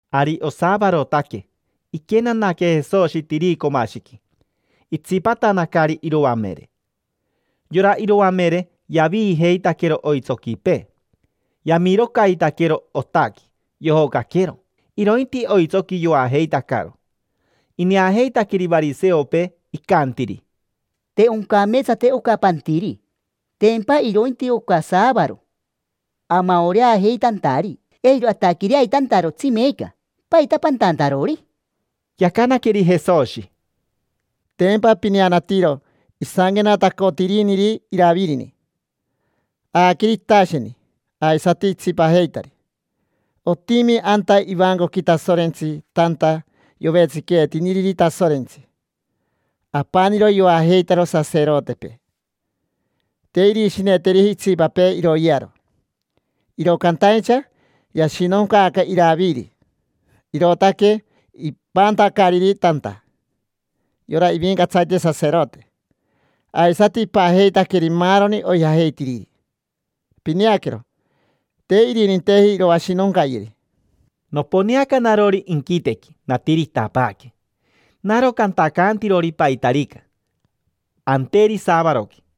Ari osaavarotaque, iquenanaque Jesoshi tiricomashiqui, itsipatanacari iroamere. Yora iroamere yaviijeitaquero oitsoquipee, yamirocaitaquero otaqui, yojocaquero. Irointi oitsoqui, yoajeitacaro. Ineajeitaqueri variseopee, icantiri: —Te oncameetsateji oca pantiri. Tempa irointi oca saavaro, amaoreajeitantari, eiro ataquireaitantarotsi meeca. ¿Paita pantantarori? Yacanaqueri Jesoshi: —Tempa pineanatiro isanquenatacotiriniri Iravirini. Aaqueri itasheni aisati itsipajeitari. Otimi anta ivancoqui Tasorentsi tanta yovetsiqueetiniriri Tasorentsi. Apaniro yoajeitaro saserotepee, te irishineteriji itsipapee iroyearo. Iro cantaincha yashinoncaaca Iraviri, irootaque ipantacariri tanta yora ivincatsarite saserote, aisati ipajeitaqueri maaroni oijajeitiriri. Pineaquero, te irininteji iroashinoncayeri. Noponeaca narori inquitequi, natiritapaaque: naro cantacantirori paitarica anteri saavaroqui.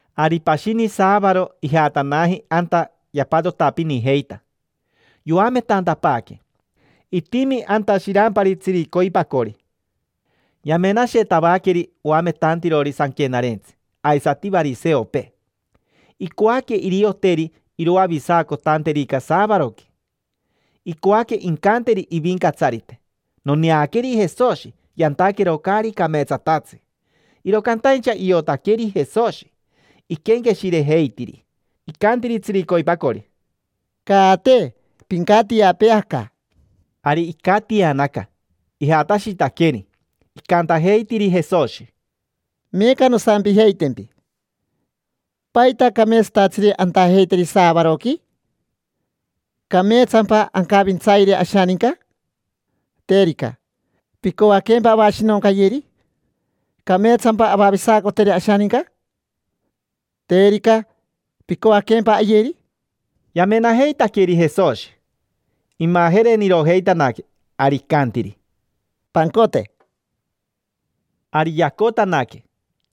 Ari pashini saavaro ijatanaji anta yapatotapinijeita, yoametantapaaque. Itimi anta shirampari tsiricoipacori. Yamenashetavaqueri oametantirori sanquenarentsi aisati variseopee, icoaque irioteri iroavisacotanterica saavaroqui. Icoaque incanteri ivincatsarite: “Noneaqueri Jesoshi yantaquero caari cameetsatatsi”. Iro cantaincha iotaqueri Jesoshi iquenqueshirejeitiri. Icantiri tsiricoipacori: —Caate, pincatiapee aca. Ari icatianaca, ijatashitaqueri. Icantajeitiri Jesoshi: —Meeca nosampijeitempi. ¿Paita cameetsatatsiri antajeiteri saavaroqui? ¿Cameetsampa ancavintsayeri ashaninca? Terica, ¿picoaquempa avashinoncayeri? ¿Cameetsampa avavisacoteri ashaninca? Terica, ¿picoaquempa ayeri? Yamenajeitaqueri Jesoshi, imajerenirojeitanaque. Ari icantiri: —Pancote. Ari yacotanaque,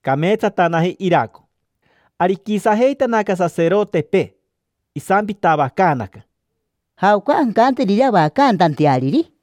cameetsatanaji iraco. Ari iquisajeitanaca saserotepee. Isampitavacaanaca: —¿Jaoca ancanteriri avacantanteariri?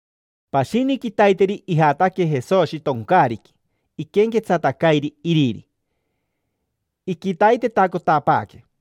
Pashini quitaiteri ijataque Jesoshi toncaariqui, iquenquetsatacairi iriri, iquitaitetacotapaaque.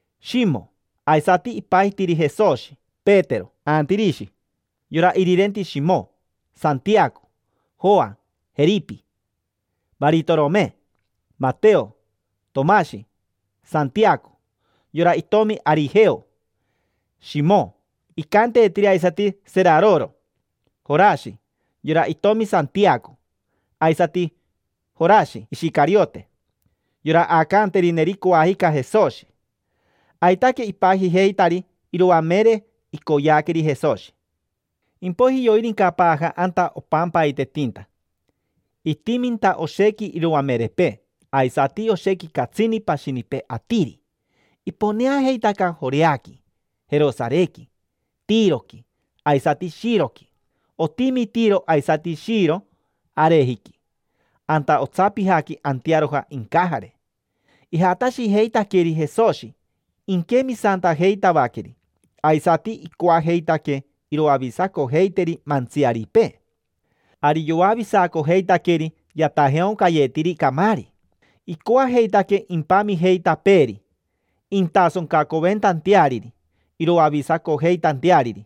Shimo (aisati ipajitiri Jesoshi: Petero), Antirishi (yora irirenti Shimo), Santiaco, Joa, Jeripi, Varitorome, Mateo, Tomashi, Santiaco (yora itomi Arijeo), Shimo (icanteetiri aisati Seraroro), Jorashi (yora itomi Santiaco), aisati Jorashi Ishicariote (yora aacanterineri coajica Jesoshi). Aitaque ipajijeitari iroamere icoyeaqueri Jesoshi. Impoiji yoirincapaaja anta opampaitetinta. Itiminta oshequi iroamerepee, aisati oshequi catsini pashinipee atiri: iponeajeitaca Joreaqui, Jerosarequi, Tiroqui, aisati Shiroqui. Otimi Tiro aisati Shiro arejiqui, anta otsapijaqui antearoja incajare. Ijatashijeitaqueri Jesoshi inquemisantajeitavaqueri, aisati icoajeitaque iroavisacojeiteri mantsiaripee. Ari yoavisacojeitaqueri yatajeaoncayetiri camaari. Icoajeitaque impamijeitapeeri, intasoncacoventanteariri iroavisacojeitanteariri.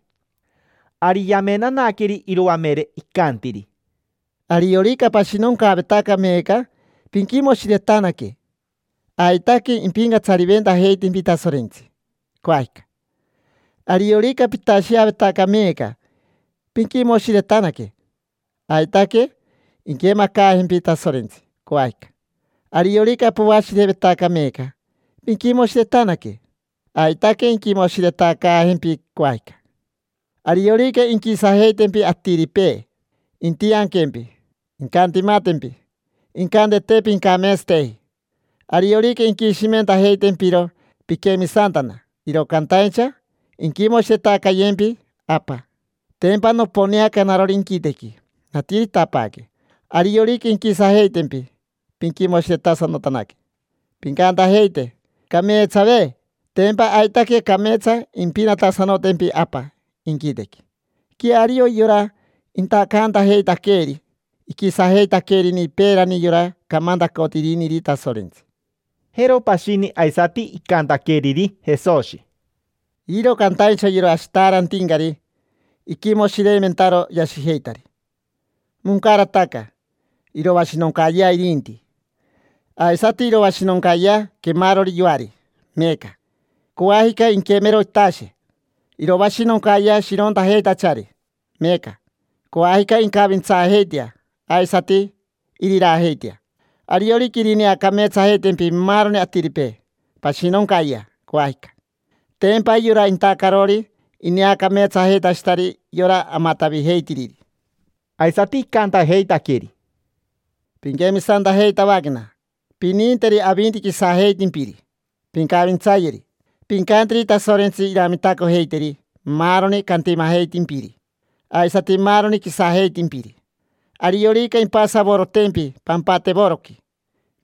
Ari yamenanaqueri iroamere, icantiri: —Ariorica pashinoncaavetaca meeca, pinquimoshiretanaque: aitaque impincatsariventajeitempi Tasorentsi, coajica. Ariorica pitasheavetaca meeca, pinquimoshiretanaque: aitaque inquemacaajempi Tasorentsi, coajica. Ariorica poashirevetaca meeca, pinquimoshiretanaque: aitaque inquimoshiretacaajempi, coajica. Ariorica inquisajeitempi atiripee, intianquempi, incantimatempi, incante te pincameetsateji. Ariorica inquishimentajeitempiro piquemisantana, iro cantaincha inquimoshiretacayempi Apa. Tempa noponeaca narori inquitequi, natiritapaaque. Ariorica inquisajeitempi, pinquimoshiretasanotanaque, pincantajeite: “Cameetsave”. Tempa aitaque cameetsa impinatasanotempi Apa inquitequi. Queario yora intacantajeitaqueeri iquisajeitaquerini peerani yora camantacotiriniri Tasorentsi. Jero pashini aisati icantaqueriri Jesoshi: —Iro cantaincha yora ashitaarantincari, iquimoshireimentaro yashijeitari: moncarataca, iroashinoncayea irinti. Aisati iroashinoncayea quemarori yoari meeca: coajica inquemero itashe. Iroashinoncayea shirontajeitachari meeca: coajica incavintsaajeitea aisati iriraajeitea. Ariorica irineacameetsajeitempi maaroni atiripee, pashinoncayea coajica: tempa yora intacarori ineacameetsajeitashitari yora amatavijeitiriri. Aisati icantajeitaqueri: —Pinquemisantajeitavaquena: pininteri avinti quisajeitimpiri, pincavintsayeri. Pincanteri Tasorentsi iramitacojeiteri maaroni cantimajeitimpiri, aisati maaroni quisajeitimpiri. Ariorica impasavorotempi pampatevoroqui,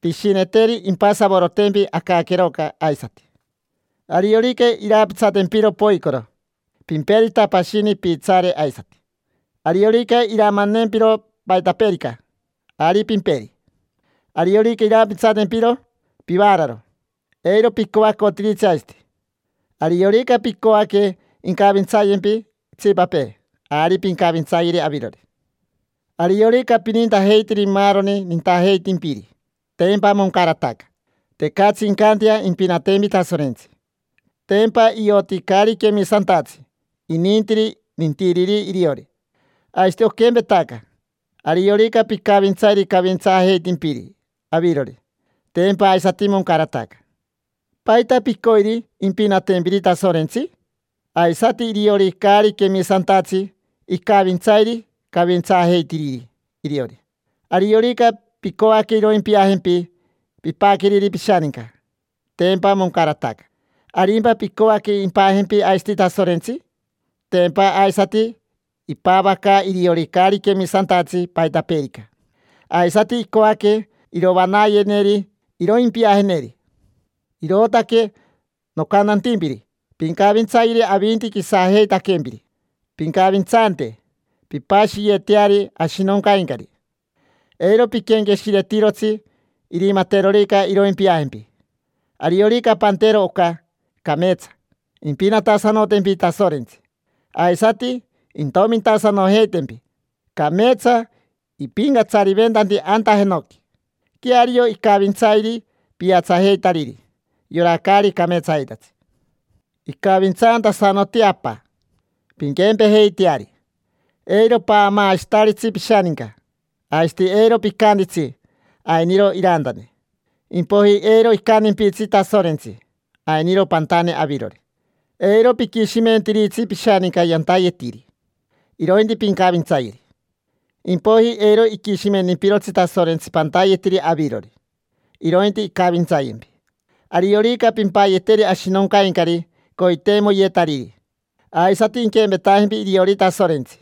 pishineteri impasavorotempi acaqueroca aisati. Ariorica iraapitsatempiro poicoro, pimperita pashini piitsaare aisati. Ariorica iramanempiro paitapeerica, ari pimperi. Ariorica iraapitsatempiro pivaararo, eiro picoacotiritsi aisati. Ariorica picoaque incavintsayempi itsipapee, ari pincavintsayeri avirori. Ariorica pinintajeitiri maaroni nintajeitimpiri, tempa moncarataca: tecatsi incantea impinatempi Tasorentsi. Tempa ioti caari quemisantatsi inintiri nintiriri iriori. Aisati oquempetaca: ariorica picavintsairi cavintsaajeitimpiri avirori, tempa aisati moncarataca. ¿Paita picoiri impinatempiri Tasorentsi? Aisati iriori caari quemisantatsi, icavintsairi cavintsaajeitiriri iriori. Ariorica picoaque iroimpiajempi pipaqueriri pishaninca, tempa moncarataca: ¿Arimpa picoaque impajempi aisati Tasorentsi? Tempa aisati ipavacaa iriori caari quemisantatsi paitapeerica, aisati icoaque irovanayeneri iroimpiajeneri. Irootaque nocantantimpiri pincavintsayeri avinti quisajeitaquempiri, pincavintsante, pimpashiyeteari ashinoncaincari: eiro piquenqueshiretirotsi irimaterorica iroimpiajempi. Ariorica pantero oca, cameetsa: impinatasanotempi Tasorentsi, aisati intomintasanojeitempi. Cameetsa ipincatsariventanti anta jenoqui. Queario icavintsairi piatsajeitariri, yora caari cameetsajeitatsi. Icavintsantasanoti Apa: pinquempejeiteari. Eiro paamaashitaritsi pishaninca, aisati eiro picantitsi: “Ainiro irantane”, impoiji eiro icantimpitsi Tasorentsi: “Ainiro pantane avirori”. Eiro piquishimentiritsi pishaninca yantayetiri, irointi pincavintsayeri: impoiji eiro iquishimentimpirotsi Tasorentsi pantayetiri avirori, irointi incavintsayempi. Ariorica pimpayeteri ashinoncaincari coiteimoyetariri, aisati inquempetajempi iriori Tasorentsi: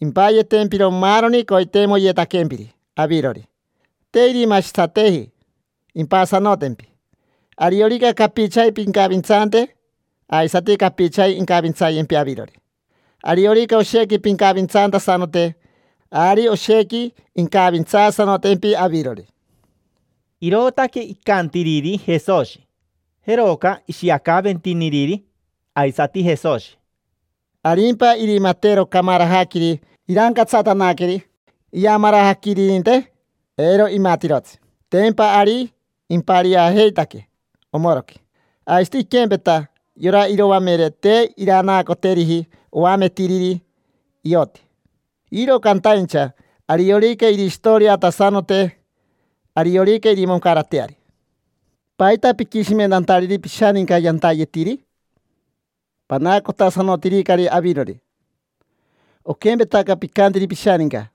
impayetempiro maaroni coiteimoyetaquempiri avirori. Te irimashitsateji: impasanotempi. Ariorica capichaji pincavintsante, aisati capichaji incavintsayempi avirori. Ariorica oshequi pincavintsantasanote, ari oshequi incavintsaasanotempi avirori. Irootaque icantiriri Jesoshi. Jeroca ishiacaaventiniriri aisati Jesoshi: —¿Arimpa irimatero camarajaquiri irancatsatanaqueri iamarajaquiririnte? Eiro imatirotsi: tempa ari impariajeitaque omoroqui. Aisati iquempeta, yora iroamere te iranaacoteriji oametiriri ioti. Iro cantaincha ariorica irishitoriatasanote, ariorica irimoncarateari. ¿Paita piquishimentantariri pishaninca yantayetiri? Panaacotasanotiricari avirori. Oquempetaca picantiri pishaninca: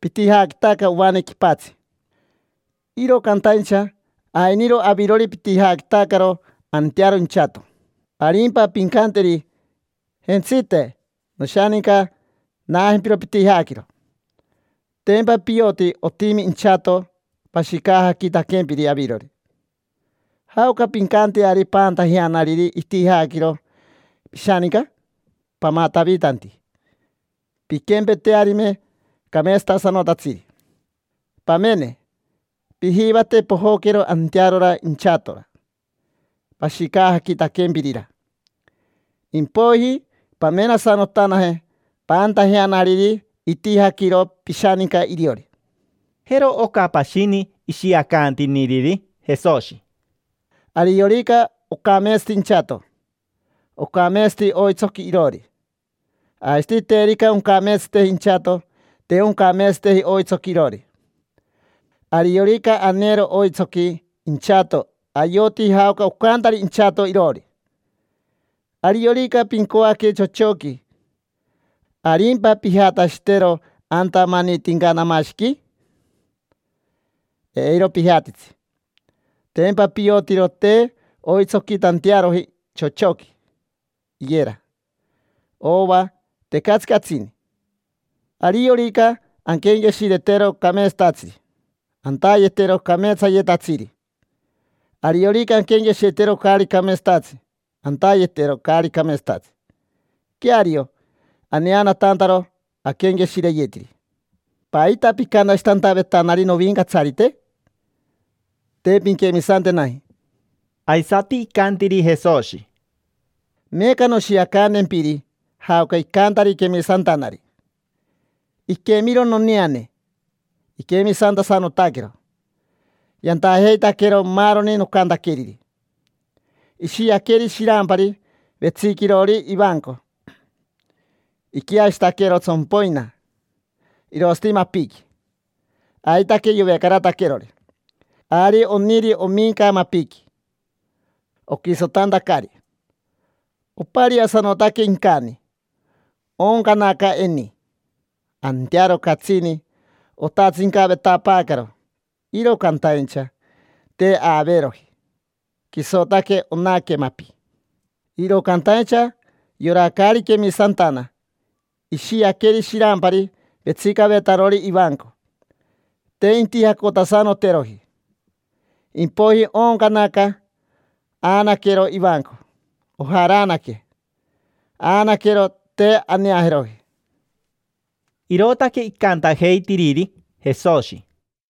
“Pitijaquitaca ovane quipatsi”, iro cantaincha ainiro avirori pitijaquitacaro antearo inchato. Arimpa pincanteri: “Jentsite, noshaninca, naajempiro pitijaquiro”. Tempa pioti otimi inchato pashicajaquitaquempiri avirori. ¿Jaoca pincanteari paantajeanariri itijaquiro pishaninca? Pamatavitanti, pinquempetearime cameetsatasanotatsiri. Pamene, pijivate pojoquero antearora inchatora pashicajaquitaquempirira, impoiji pamenasanotanaje paantajeanariri itijaquiro pishaninca iriori. Jero oca pashini ishiacantiniriri Jesoshi: —Ariorica ocameetsati inchato, ocameetsati oitsoqui iroori. Aisati terica oncameetsateji inchato, te oncameetsateji oitsoqui iroori. Ariorica aneero oitsoqui inchato ayoti jaoca ocantari inchato iroori. Ariorica pincoaque chochoqui, ¿arimpa pijatashitero anta manitincanamashiqui? Eiro pijatitsi, tempa piotiro te oitsoquitantearoji chochoqui, iyera, ova, tecatsi catsini. Ariorica anquenqueshiretero cameetsatatsiri, antayetero cameetsayetatsiri. Ariorica anquenqueshiretero caari cameetsatatsi, antayetero caari cameetsatatsi. Queario, aneanatantaro aquenqueshireyetiri. ¿Paita picantashitantavetanari: “Novincatsarite”? Te pinquemisantenaji. Aisati icantiri Jesoshi: —Meeca noshiacantempiri jaoca icantari quemisantanari. Iquemiro noneane, iquemisantasanotaquero: yantajeitaquero maaroni nocantaqueriri. Ishiaqueri shirampari vetsiquirori ivanco. Iquiashitaquero tsompoina, irosati mapiqui aitaque yovecarataquerori. Ari oniri ominca mapiqui, oquisotantacari. Opariasanotaque incani, ooncanaca eni. Antearo catsini otatsincavetapaacaro, iro cantaincha te aaveeroji: quisotaque onaque mapi. Iro cantaincha yora caari quemisantana ishiaqueri shirampari vetsicavetarori ivanco, te intijacotasanoteroji. Impoiji ooncanaca, aanaquero ivanco. Ojaraanaque, aanaquero, te aneajeroji. Irootaque icantajeitiriri Jesoshi.